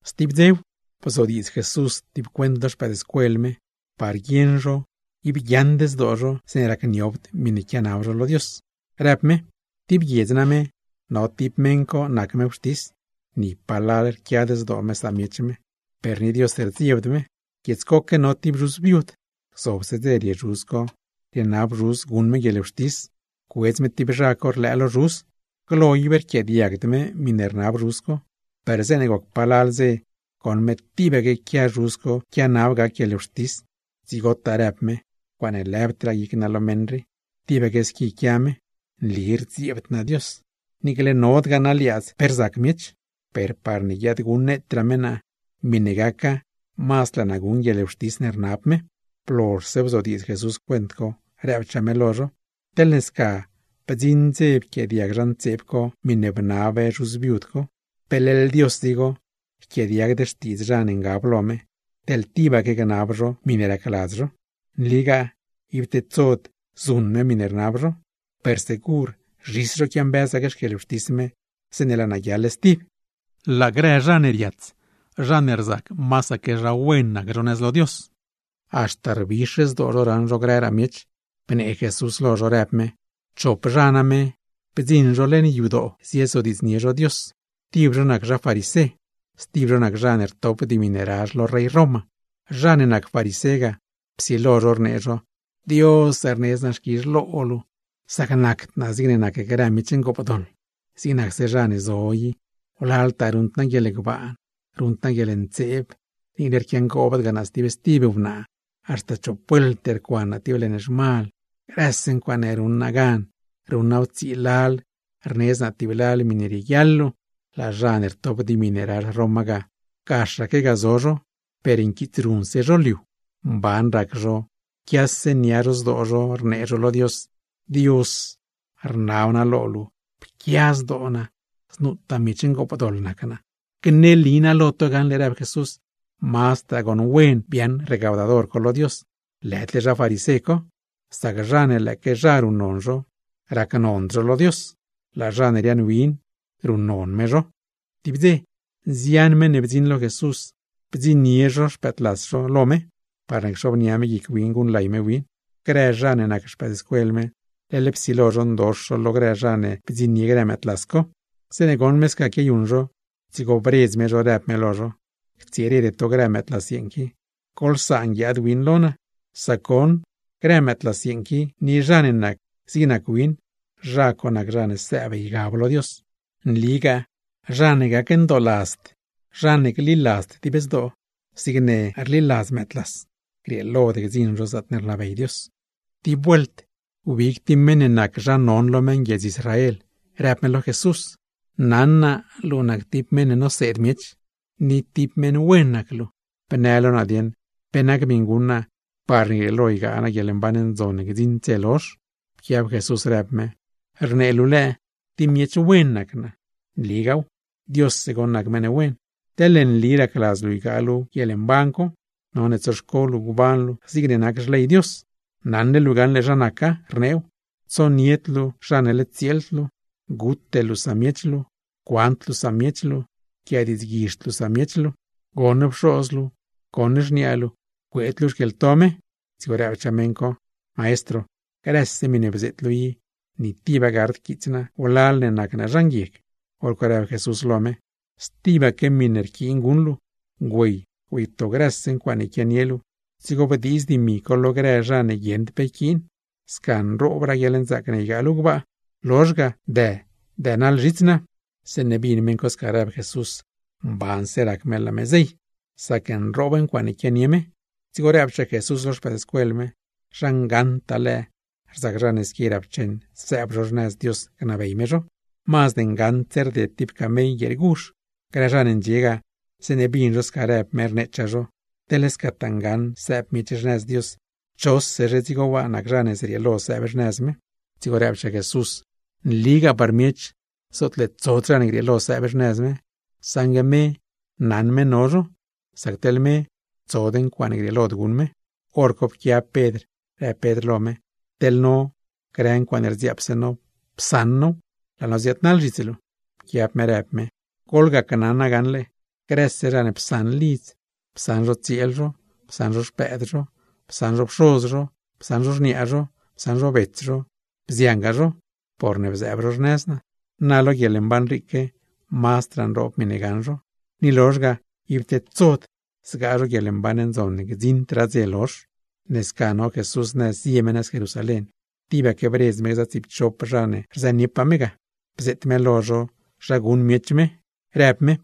Stib dzew, bzodiidz Jesús tib cuent lo xpëëdscuel me, par guieṉ zho ib guiaaṉd zdoo zho zeeṉe racniobd miṉe quianab zho lo Dios, rëb me: ―Tib guiedz name, no tib meṉ co nac me wxtis, ni palal rquiad zdoo me samiech me, per ni Dios rdziebd me. Guiedz coque no tib zhuz viud, gzobse dze rie zhuz co rienab zhuz guṉ me guieḻwxtis, cuedz me tib zha co rlëë lo zhuz. Glo ib rquiaadiagd me miṉe rnab zhuz co, per zeeṉe goc palal dze goṉ me tibaque quia meṉ co quianab me gac guieḻwxtis, dzigotaa rëb me: “Ncuaaṉe lëbdraa guic naa lo meṉ rii, tibaque squi quia me. Nli rdziebd naa Dios, niicle nodgaa naa liaadz pe rzac miech, per parne guiadguṉneetraa me naa, miṉe naca mazd laa naa guṉ guieḻwxtis ne rnab me.” Blozhse bzodiidz Jesús cuent co, rëbchaa me lo zho: ―Teḻne sca bdziṉ dze ne pquiaadiag zha ntseeb co miṉe bnab wnaa viud co, ¿pe leḻ Dios dzigo yquiaadiagd xtiidz zha ne ngab lo me, teḻ tibaque gnab zho miṉe racladz zho? ¡Nligaa, ib tedsod zuṉ me miṉe rnab zho! Per segur zhis zho quiambëz gac xquieḻwxtis me, zeeṉe laa naa guiaḻ stib. Laa grë zha ne riats, zha ne rzac masaque zha wen nac zho nëz lo Dios, haxta rbix zdoo zho raṉ zho grëraa miech, bnee Jesús lo zho, rëb me: ―Chop zha name, bdziṉ zho leṉ yadoo ziezodiidznie zho Dios. Tib zho nac zha farisé, stib zho nac zha ne rtop dimi ne razh lo rey Roma. Zha ne nac farisé ga, psilo zho rnee zho: “Dios, rnedz naa xquizh lo luu, sac nacd naa zigne nac grë miech ngoopdoḻ, zig nacse zha ne zo i. Wlaltaa ruṉd naa guieḻgbaan, ruṉd naa guieḻntseeb, niicle rquiangoobd naa stib wnaa. Haxta chop vuelt rcuan naa tib leṉ zhmal, grëse ncuaaṉe ruṉ naa gan, ruṉ naaw tsii lal, rnedz naa tib lal miṉe rieguiaḻ luu.” Laa zha ne rtop dimi ne razh Roma ga, gaxaque ga zo zho, per nquiitsruṉse zho liu. Mban rac zho, quiase nia zho zdoo zho, rnee zho lo Dios: “¡Dios, rnab naa lo luu pquia zdoo naa znutaa miech ngoopdoḻ nac naa!” ’Gneli naa lo to gaṉle ―rëb Jesús―, mazdraa goṉ wen biaaṉ recaudador co lo Dios, lëdle zha farisé co. Sac zha ne lëëque zha ruṉnon zho, racnond zho lo Dios, laa zha ne riaaṉwin, ruṉnon me zho. Tib dze, nzian meṉ ne bdziṉ lo Jesús, bdziṉnie zho xpëëdlas zho lo me, parne cxobnia me guic win guṉlay me win. Grë zha ne nac xpëëdscuel me, leḻ psilo zho ndox zho lo grë zha ne bdziṉnie grë mëëdlas co. Zeeṉe goṉ me sca quiayuṉ zho, dzigo bredz me zho, rëb me lo zho: ―¡Ctsirede to grë mëëdlas yeeṉ qui! ¡Goḻsaan guiaad win lo naa! Sac goṉ grë mëëdlas yeeṉ qui, ni zha ne nac zig nac win, zha co nac zha ne sëëb ygab lo Dios. Nligaa zha ne gacndooladzd, zha ne gliladzd dib zdoo, zigne ruṉ grë mëëdlas, grieelod gdziṉ zho zaatne rnabey Dios. Tib vuelt, wbig tib meṉ ne nac zha non lo meṉguiedz Israel, rëb me lo Jesús: ―Naṉ naa luu nac tib meṉ ne noseed miech, ni tib meṉ wen nac luu, ¿bnë lo naa dieṉ, pe nac miṉe guṉ naa parne grieelo ygaa naa guieḻmban ndzon ne gdziṉd dze lozh? Pquiab Jesús rëb me: ―Rnee luu lëë tib miech wen nac naa. ¡Nligaaw, Diosse goṉ nac meṉ wen! Teḻne nli racladz luu ygaa luu guieḻmban co, none tsoxco luu gban luu zigne nac Xley Dios. Naṉle luu gaṉle zha naca, rneew: Tsonied luu zha ne led tsieeld luu, gute luu samiech luu, cuand luu samiech luu, yquiadiidzguizhd luu samiech luu. Goṉ pxoz luu, goṉ xniaa luu, cueed luu xquieḻto me. Dzigo rëbchaa meṉ co: ―Maestro, grëse miṉe bzeet luu i, ni tiba gard quits naa wlal ne nac naa zha nguieg. Horco rëb Jesús lo me: ―Stibaque miṉe rquiin guṉ luu. Güey, güeyto grëse ncuaaṉe quianie luu, dzigo bdiiz dimi co lo grë zha mban ne guieṉd pe yquiin; sca nroobraa guieḻnzaac ne ygaa luu gbaa. Lozh ga, dë, dënaḻ zhits naa. Zeeṉe bin meṉ co sca rëb Jesús, mbanse rac me laa me zey; sac nroob ncuaaṉe quianie me. Dzigo rëbchaa Jesús lo xpëëdscuel me: ―¡Zha ngaṉtaa lëë, rzac zha ne squi rapcheṉ sëëb zho xnëz Dios gnabey me zho! Mazd ngaṉdse rded tib camell guieer guzh. Grë zha ne ndxie ga, zeeṉe bin zho sca rëb me, rneechaa zho: ―Teḻne scataa ngaṉ sëëb miech xnëz Dios, ¿chosezhe dzigo waa nac zha ne zrieelo sëëb xnëz me? Dzigo rëbchaa Jesús: ―Nligaa par miech, zootle tsod zha ne grieelo sëëb xnëz me; saṉgue me naṉ me no zho. Sac teḻ me, tsod ncuaaṉe grieelod guṉ me. Horco pquiab Pedr, rëb Pedr lo me: ―Teḻ no, grë ncuaaṉe rdziaapse no psaṉ now, laa no ziaadnaḻ zhits luu. Pquiab me rëb me: ―Goḻgacnaṉa gaṉle, grëse zha ne psaṉ lidz, psaṉ zho tsieel zho, psaṉ zho xpëëd zho, psaṉ zho pxoz zho, psaṉ zho xniaa zho, psaṉ zho bets zho, bziangaa zho, porne bzëëb zho xnëz Dios, na lo guieḻmban riique, mazdraa nroob miṉe gaṉ zho, ni lozh ga ib tedsod zgaa zho guieḻmban ndzon ne gdziṉdraa dze lozh. Ne sca no Jesús nëz zie me nëz Jerusalén, tibaque bredz me gza tsiipchop zha ne rzëniepaa me ga, bzeet me lo zho zha guṉ miech me, rëb me: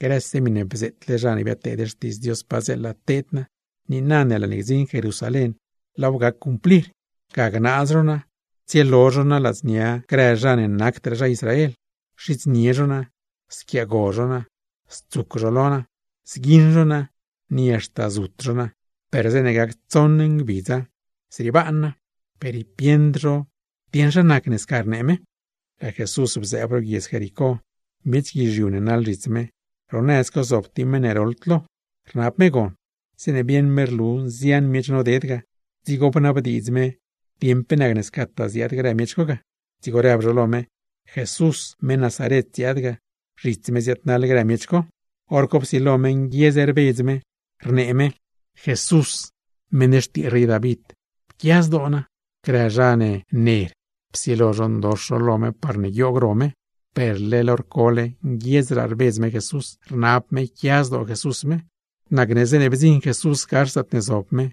―Grëse miṉe bzeetle zha ne biadteed xtiidz Dios padzeela teed naa, niina ne laa ne gdziṉ Jerusalén, laaw gac cumplir. Ga gnaaz zho naa, tsielo zho naa ladznia grë zha ne nacdraa zha Israel, xidznie zho naa, squiaago zho naa, stsuc zho lo naa, zguiṉ zho naa, ni haxta zut zho naa. Per zeeṉe gac tsoṉ ngbidza, zriebaan naa. Per ib bieṉd zho dieṉ zha nacne sca rnee me. Laa Jesús bzëëb ro guiedz Jericó, miech guizhiu ne naḻ zhits me. Ro nëz co zob tib meṉ ne roḻd lo, rnab me gon. Zeeṉe bieṉ me rlu nzian miech noded ga, dzigo bnabdiidz me dieṉ pe nacne scataa ziaad grë miech co ga. Dzigo rëb zho lo me, Jesús, meṉ Nazaret ziaad ga, zhits me ziaadnaḻ grë miech co. Horco psilo me nguiedz rbedz me, rnee me: ―¡Jesús, meṉ xtii rey David, pquia zdoo naa! Grë zha ne ner, psilo zho ndox zho lo me parne guioog ro me, per leḻ hor cole nguiedzraa rbedz me Jesús, rnab me yquia zdoo Jesús me. Nacne zeeṉe bdziṉ Jesús gax zaatne zob me,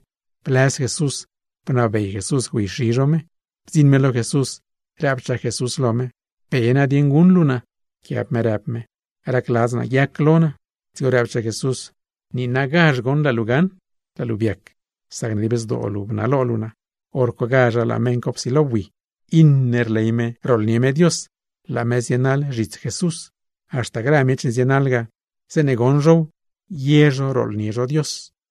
blëz Jesús, bnabey Jesús güeyxi zho me. Bdziṉ me lo Jesús, rëbchaa Jesús lo me: ―¿Pe nadieṉ guṉ luu naa? Pquiab me rëb me: ―¡Racladz naa guiac lo naa! Dzigo rëbchaa Jesús: ―¡Niinagazh goṉ laa luu gaṉ stib! Laa luu biac, sacne dib zdoo luu bnalo luu naa. Horcogazh laa meṉ co psilo bui, iṉe rley me rooḻnie me Dios, laa me zienaḻ zhits Jesús. Haxta grë miech ne zienaḻ ga, zeeṉe goṉ zhow, ye zho rooḻnie zho Dios.